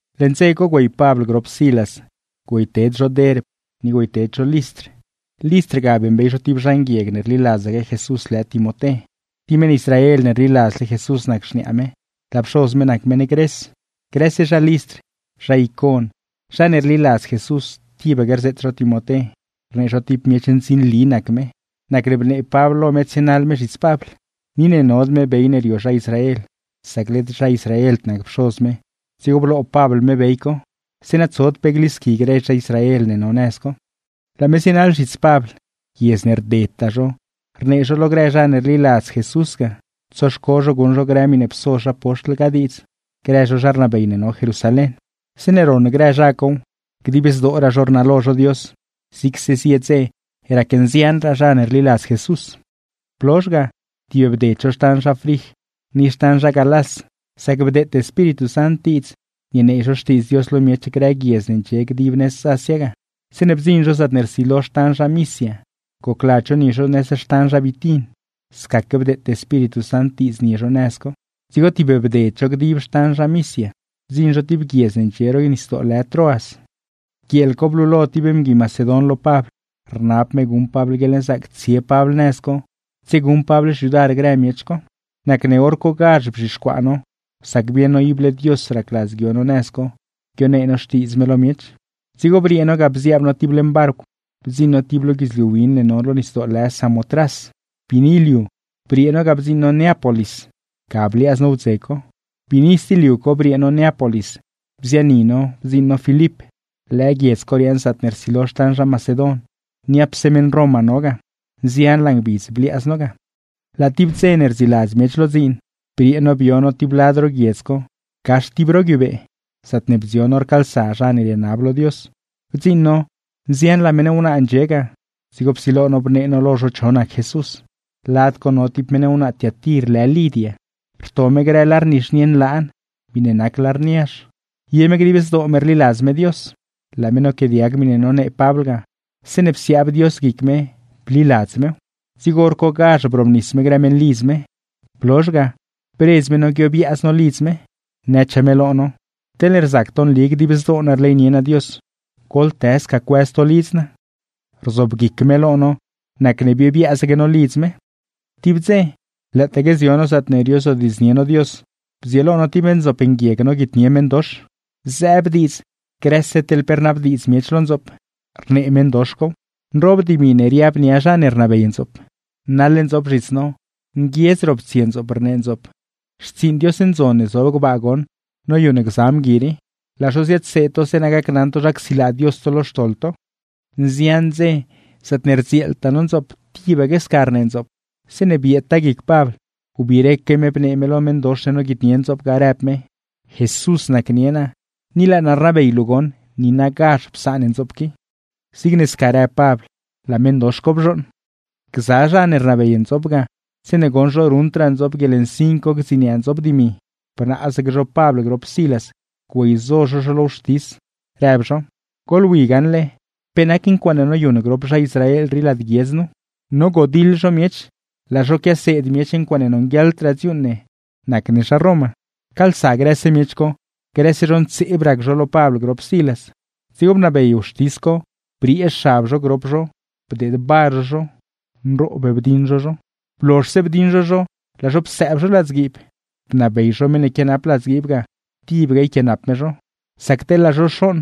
Leṉ dze co güey Pabl grop Silas güeyted zho Derb ni güeyted zho Listr. Listr ga beeṉbey zho tib zha nguieg ne rliladzaque Jesús lë Timoté, ti meṉ Israel ne rliladzle Jesús nac xniaa me, laa pxoz me nac meṉ Gres. Grëse zha Listr, zha Icon, zha ne rliladz Jesús tibaque rzeet zho Timoté rnee zho ti miech ndzinli nac me, nacne bnee Pabl lo me tsienaḻ me zhits Pabl. Ni ne nod me bey ne rio zha Israel sac led zha Israeld nac pxoz me, dzigo bloo Pabl me bey co, zeeṉa tsod pe glisqui grë zha Israel ne no nëz co. Laa me zienaḻ zhits Pabl. Guiedz ne rdedtaa zho rnee zho lo grë zha ne rliladz Jesús ga, tsoxco zho guṉ zho grë miṉe pso zha poxtl ga diidz, grë zho zha rnabey ne no Jerusalén. Zeeṉe ron grë zha cow, dib zdooraa zho rnalo zho Dios, zigse zie dze racnzianraa zha ne rliladz Jesús. Blozh ga, tibbded zho xtan zha Frij ni xtan zha Galás, sac bdeete Espíritu Sant diidz nienee zho Xtiidz Dios lo miech grë guiedz ne ndxie nëz Asia ga. Zeeṉe bdziṉ zho zaatne rsilo xtan zha Misia gocladz zho nie zho nëz xtan zha Bitin, scaque bdeete Espíritu Sant diidz nie zho nëz co. Dzigo tibbded zho dib xtan Misia bdziṉ zho ti guiedz ne ndxie ro nisdoo lë Troas. Guieel co blulo ti mgui Macedon lo Pabl, rnab me guṉ Pabl guieḻnzaac tsie Pabl nëz co, tsieguṉ Pabl xyudar grë miech co. Nacne hor cogazh bzhixcuaa no, sac bieṉ no ible Dios racladz guio no nëz co guionee no Xtiidz me lo miech. Dzigo briee no ga bziaab no ti leṉ barcw bdziṉ no ti lo guidzliu win ne no lo nisdoo lë Samotras. Biini liu briee no ga bdziṉ no Neápolis, ga bliaaz no wdze co. Biini sti liu co briee no Neápolis bziani no bdziṉ no Filip. Lëë guiedz co riaaṉ zaatne rsilo xtan zha Macedon, niapse meṉ Roma no ga; nzianlaa ngbidz bliaaz no ga. Laa tib dze ne rdziiladz miech lo dziin, briee no bio no tib lad ro guiedz co, gax ti ro guiubee, zaatne bdzion no rcaalsa zha ne rienab lo Dios. Bdziṉ no nzianlaa meṉ wnaa ndxie ga, dzigo psilo no bnee no lo zho cho nac Jesús. Lad co no ti wnaa Tiatir lë Lidia, rto me grë lar nizhnie nlaan miṉe nac lar niazh; ye me dib zdoo me rliladz me Dios. Laa me noquiaadiag miṉe nonee Pabl ga, zeeṉe psiaab Dios guic me bliladz mew. Dzigo hor cogazh brobnis me grë meṉlidz me; blozh ga, bredz me no guiobiaaz no lidz me, nëchaa me lo no: ―Teḻne rzac to nli dib zdoo naa rleynie naa Dios, goḻtë sca cuëz to lidz naa. Rzoobguic me lo no, nacne biobiaazaque no lidz me. Tib dze, lëëtaque zio no zaatne riozodiidznie no Dios, bdzieelo no ti ndzoop nguieg noguitnie meṉdox. Zëëb diidz grëse teḻ pe rnabdiidz miech lo ndzoop, rnee meṉdox cow; nroob dimi ne riab nia zha ne rnabey ndzoop. Naḻ ndzoop zhits no, nguiedz roptsie ndzoop rnee ndzoop: ―¡Xtsiiṉ Dios ndzon ne zob gbaa goṉ noyuṉ gza mgui rii! ¡Laa zho ziadseed to zeeṉa gacnaṉ to zha csilaa Dios to lo xtoḻ to! Nzian dze zaatne rdzieeltaa no ndzoop tibaque sca rnee ndzoop. Zeeṉe bieedtaa guic Pabl, biireque me bnee me lo meṉdox ne noguitnie ndzoop ga, rëb me: ―Jesús nacnie naa, ni laa naa rnabey luu goṉ niinagazh psaan ndzoop qui. Zigne sca rëb Pabl laa meṉdox co bzhooṉ. Gza zha ne rnabey ndzoop ga, zeeṉe goṉ zho ruṉdraa ndzoop guieḻnsin co gdziniaa ndzoop dimi, bnaazaque zho Pabl grop Silas güeyzo zho zho lo wxtis, rëb zho: ―¡Goḻwi gaṉle pe nac ncuaaṉe noyuṉ grop zha Israel rii lad guiedz nu! ¡Nogodiḻ zho miech, laa zho quiaseed miech ncuaaṉe nonguieḻdraa dziuuṉ ne nac ne zha Roma! Pcaalsa grëse miech co, grëse zho ntseeb rac zho lo Pabl grop Silas. Dzigo bnabey wxtis co briee xab zho grop zho bdeed bar zho zho, nroob bdiṉ zho zho. Blozhse bdiṉ zho zho laa zho psëëb zho ladzguiib, bnabey zho meṉ ne quianap ladzguiib ga tibaque yquianap me zho, sac teḻ laa zho xooṉ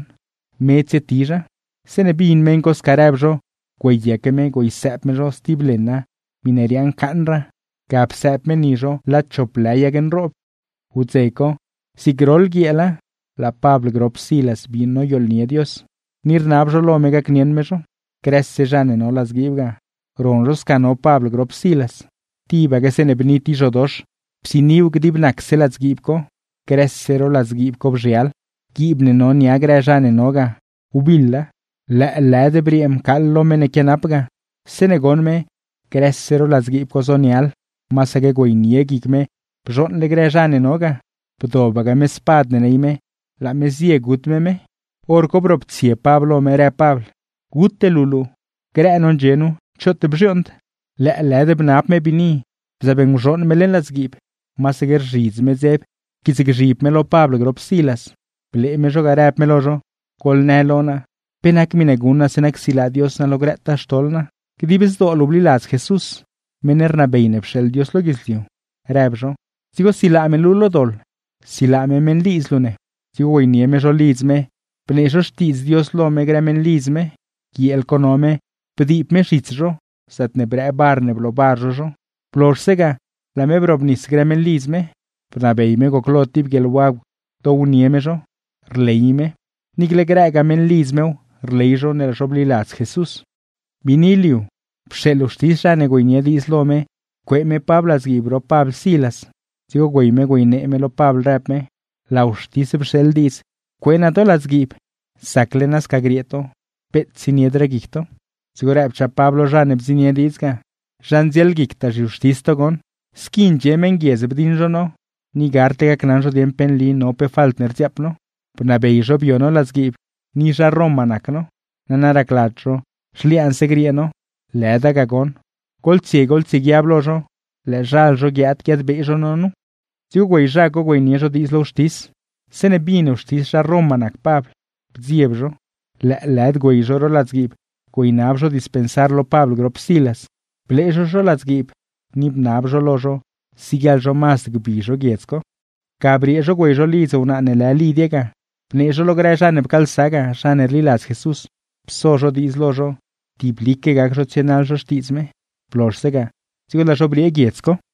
me tsietizha. Zeeṉe bin meṉ co sca rëb zho, güeyaque me güeysëëb me zho stib leṉa miṉe riaaṉ caaṉraa, ga psëëb me ni zho lad chop lë yag nroob. Wdze co, zig groḻ guieela laa Pabl grop Silas bii noyooḻnie Dios, ni rnab zho lo me gacnieṉ me zho. Grëse zha ne no ladzguiib ga, ron zho sca no Pabl grop Silas. Tibaque zeeṉe bni ti zhodox, psiniw dib nacse ladzguiib co, grëse ro ladzguiib co bzhial, guiib ne no nia grë zha ne no ga, wbiḻa. Lëëlëd briee mcaaḻlo meṉ ne quianap ga, zeeṉe goṉ me grëse ro ladzguiib co zonial, masaque güeynie guic me bzhooṉle grë zha ne no ga, bdobaque me spad ne ney me laa me zie gut me me. Horco broptsie Pabl lo me, rëb Pabl: ―¡Gute luu luu! ¡Grë no ndxie no, choot bzhiooṉd! Lëëlëd bnab me biini, bzëëb nguzhooṉ me leṉ ladzguiib, masaque rzhidz me dzeb pquiitsgzhib me lo Pabl grop Silas. Blee me zho ga, rëb me lo zho: ―Goḻnë lo naa, ¿pe nac miṉe guṉ naa zeeṉa csilaa Dios naa lo grëtaa xtoḻ naa? ―Dib zdoo luu bliladz Jesús, meṉ rnabey ne pxeeḻ Dios lo guidzliu ―rëb zho―, dzigo silaa me luu lo doḻ, silaa me meṉlidz luu ne. Dzigo güeynie me zho lidz me, bnee zho Xtiidz Dios lo me grë meṉlidz me. Guieel co no me bdiib me zhits zho, zaatne brëë bar ne bloobar zho zho; blozhse ga, laa me brobnis grë meṉlidz me. Bnabey me goclo ti guieḻwagw downie me zho, rley me, niicle grëgaa meṉlidz mew rley zho ne laa zho bliladz Jesús. Biini liu, pxeeḻ wxtis zha ne güeynie diidz lo me cuee me Pabl ladzguiib grop Pabl Silas. Dzigo güey me güeynee me lo Pabl rëb me: ―Laa wxtis pxeeḻ diidz cuee naa to ladzguiib; zacle nasca griee to, peet tsieniedraa guic to. Dzigo rëbchaa Pabl lo zha ne bdziṉnie diidz ga: ―¡Zha ndzielguictaa zhiwxtis to goṉ! Squi ndxie meṉguiedz bdiṉ zho no, ni gardle gacnaṉ zho dieṉ pe nli no pe falt ne rdziaap no. Bnabey zho bio no ladzguiib, ni zha Roma nac no; nana racladz zho zhliaanse griee no. ¡Lëda ga goṉ! ¡Goḻtsie goḻguiab lo zho, lëëzhal zho guiaad guiadbee zho no nu! Dzigo güey zha co güeynie zho diidz lo wxtis. Zeeṉe bin wxtis zha Roma nac Pabl, bdzieb zho; lëëlëd güey zho ro ladzguiib güeynab zho dispensar lo Pabl grop Silas. Blee zho zho ladzguiib, ni bnab zho lo zho siguieḻ zho mazd gbi zho guiedz co. Ga briee zho güey zho lidz wnaa ne lë Lidia ga, bnee zho lo grë zha ne pcaalsa ga, zha ne rliladz Jesús, pso zho diidz lo zho tiblique gac zho tsienaḻ zho xtiidz me. Blozhse ga, dzigo laa zho briee guiedz co.